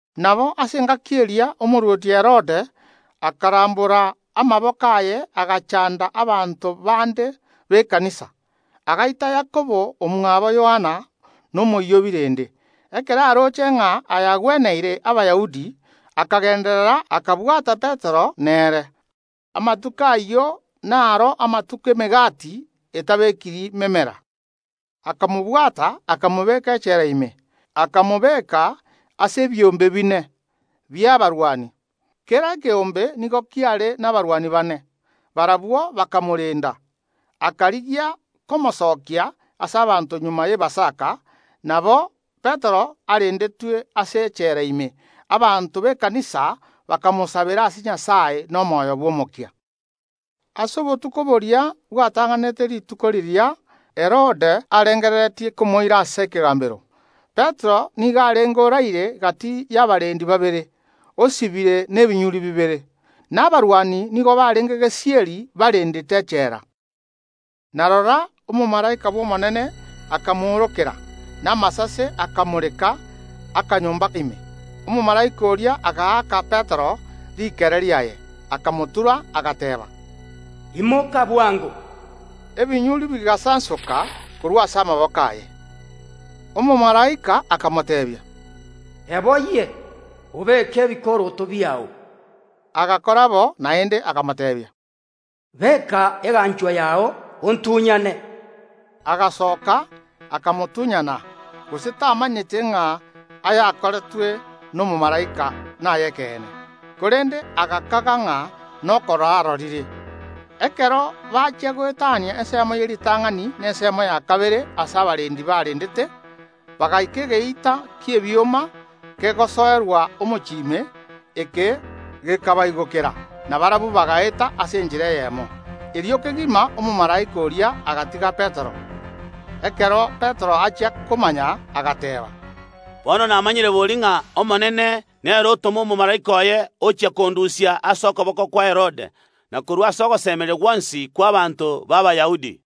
Nabo ase engaki eria, omorwoti Herode akarambora amaboko aye agachanda abanto bande b’ekanisa. Agaita Yakobo omwabo Yohana nomoyio o birende. Ekero aroche ng’a aya agweneire Abayahudi, akagenderera, Petero nere akabwatwa. Amatuko ayio naro amatuko emegati etabekiri memera. Akamobwata akamobeka echela ime. Akamobeka ase ebiombe bine bi’abarwani; kera ekeombe nigo kiare nabarwani bane. Barabwo bakamorenda. Akarigia komosokia ase abanto magega y’Epasaka. Nabo Petero arendetwe ase echela ime, abanto b’ekanisa bakamosabera ase Nyasae nomoyo bw’omokia. Ase obotuko boria bwatang’anerete rituko riria Herode arengereretie komoira ase ekegambero, Petero nigo arenge oraire gati y’abarendi babere, osibire nebinyuri bibere, na abarwani nigo barenge gesieri barendete echela. Na rora, omomalaika bw’Omonene akamoorokera, na amasase akamoreka akanyomba ime. Omomalaika oria agaaka Petero rikere riaye, akamotura, agateeba: “Imoka bwango!” Ebinyuri bigasansoka korwa ase amaboko aye. Omomalaika akamoteebia: “Eboyie, obeke ebikoroto biao.” Agakora bo. Naende akamoteebia: “Beka eganchwa yao, ontunyane!” Agasoka, akamotunyana, gose tamanyete ng’a ayakoretwe nomomalaika nay’ekeene, korende agakaga ng’a nokorora arorire. Ekero bachia goetania ensemo ye ritang’ani na ensemo ya kabere ase abarendi barendete, bagaika egeita ki’ebioma kegosoerwa omochie ime. Eke gekabaigokera, na barabwo bagaeta ase enchera eyemo. Erio kegima omomalaika oria agatiga Petero. Ekero Petero achia komanya, agateeba: “Bono namanyire bori ng’a Omonene nere otoma omomalaika oye ochia kondusia ase okoboko kwa Herode, na korwa ase ogosemeria gwonsi kw’abaanto b’Abayahudi.”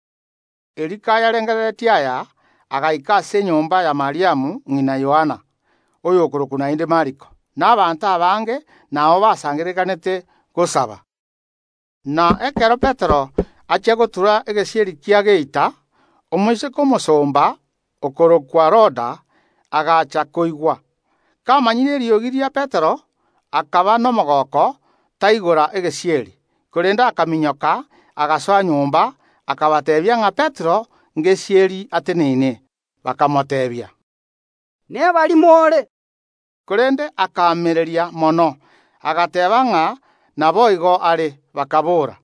Erio kayarengereretie aya, agaika ase enyomba ya Mariamu ng’ina Yohana, oyokorokwa naende Mariko; na abanto abange nao basangererekanete gosaba. Na ekero Petero achia gotura egesieri kia geita, omoiseke omosomba, okorokwa Roda, agaacha koigwa. Kamanyire eriogi ria Petero, akaba nomogooko, taigora egesieri, korende akaminyoka, agasoa nyomba, akabateebia ng’a Petero ngesieri ateneine. Bakamoteebia: “Nebarimo ore!” Korende akaamereria mono, agateeba ng’a naboigo are. Bakaboora: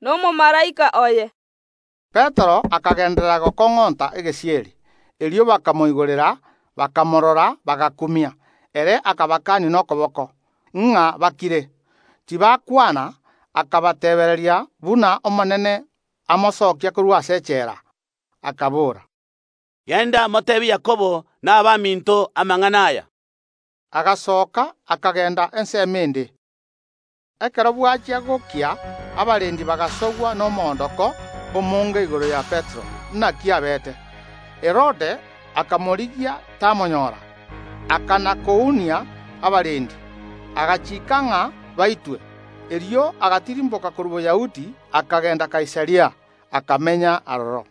“Nomomalaika oye!” Petero akagenderera gokong’onta egesieri. Erio bakamoigorera, bakamorora, bagakumia. Ere akabakania nokoboko, ng’a bakire, tibakwana, akabateebereria buna Omonene amosokia korwa ase echela. Akabora: “Genda, moteebie Yakobo na abaminto amang’ana aya.” Agasoka, akagenda ensemo ende. Ekero bwachia gokia abarendi bagasogwa nomoondoko omonge igoro ya Petero, naki abeete. Herode akamorigia, tamonyora. Akana‐kounia abarendi, agachiika ng’a baitwe. Erio agatirimboka korwa Boyahudi, akagenda Kaisaria, akamenya aroro.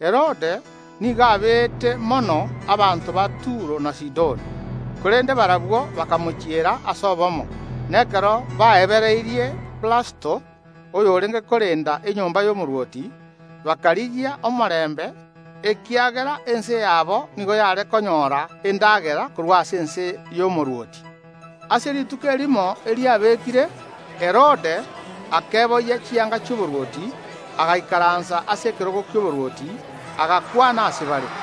Herode nigo abeete mono abanto ba Turo na Sidoni. Korende barabwo bakamochiera ase obomo, na ekero baebereirie Blasto, oyorenge korenda enyomba y’omorwoti, bakarigia omorembe, ekiagera ense yabo nigo yare konyora endagera korwa ase ense y’omorwoti. Ase rituko erimo eriabekire, Herode akeboyia chianga chi’oborwoti, agaikaransa ase ekerogo ki’oborwoti, agakwana ase bare.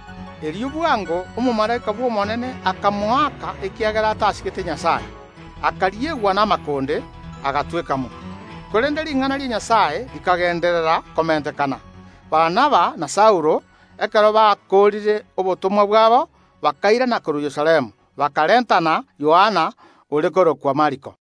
Erio bwango omomalaika bw’Omonene akamoaka ekiagera atasigete Nyasae; akariegwa namakonde, agatweka mo. Korende ring’ana ria Nyasae rikagenderera komentekana. Barnaba na Saulo, ekero bakoorire obotomwa bwabo, bakairana korwa Yerusalemu, bakarentana Yohana ore korokwa Mariko.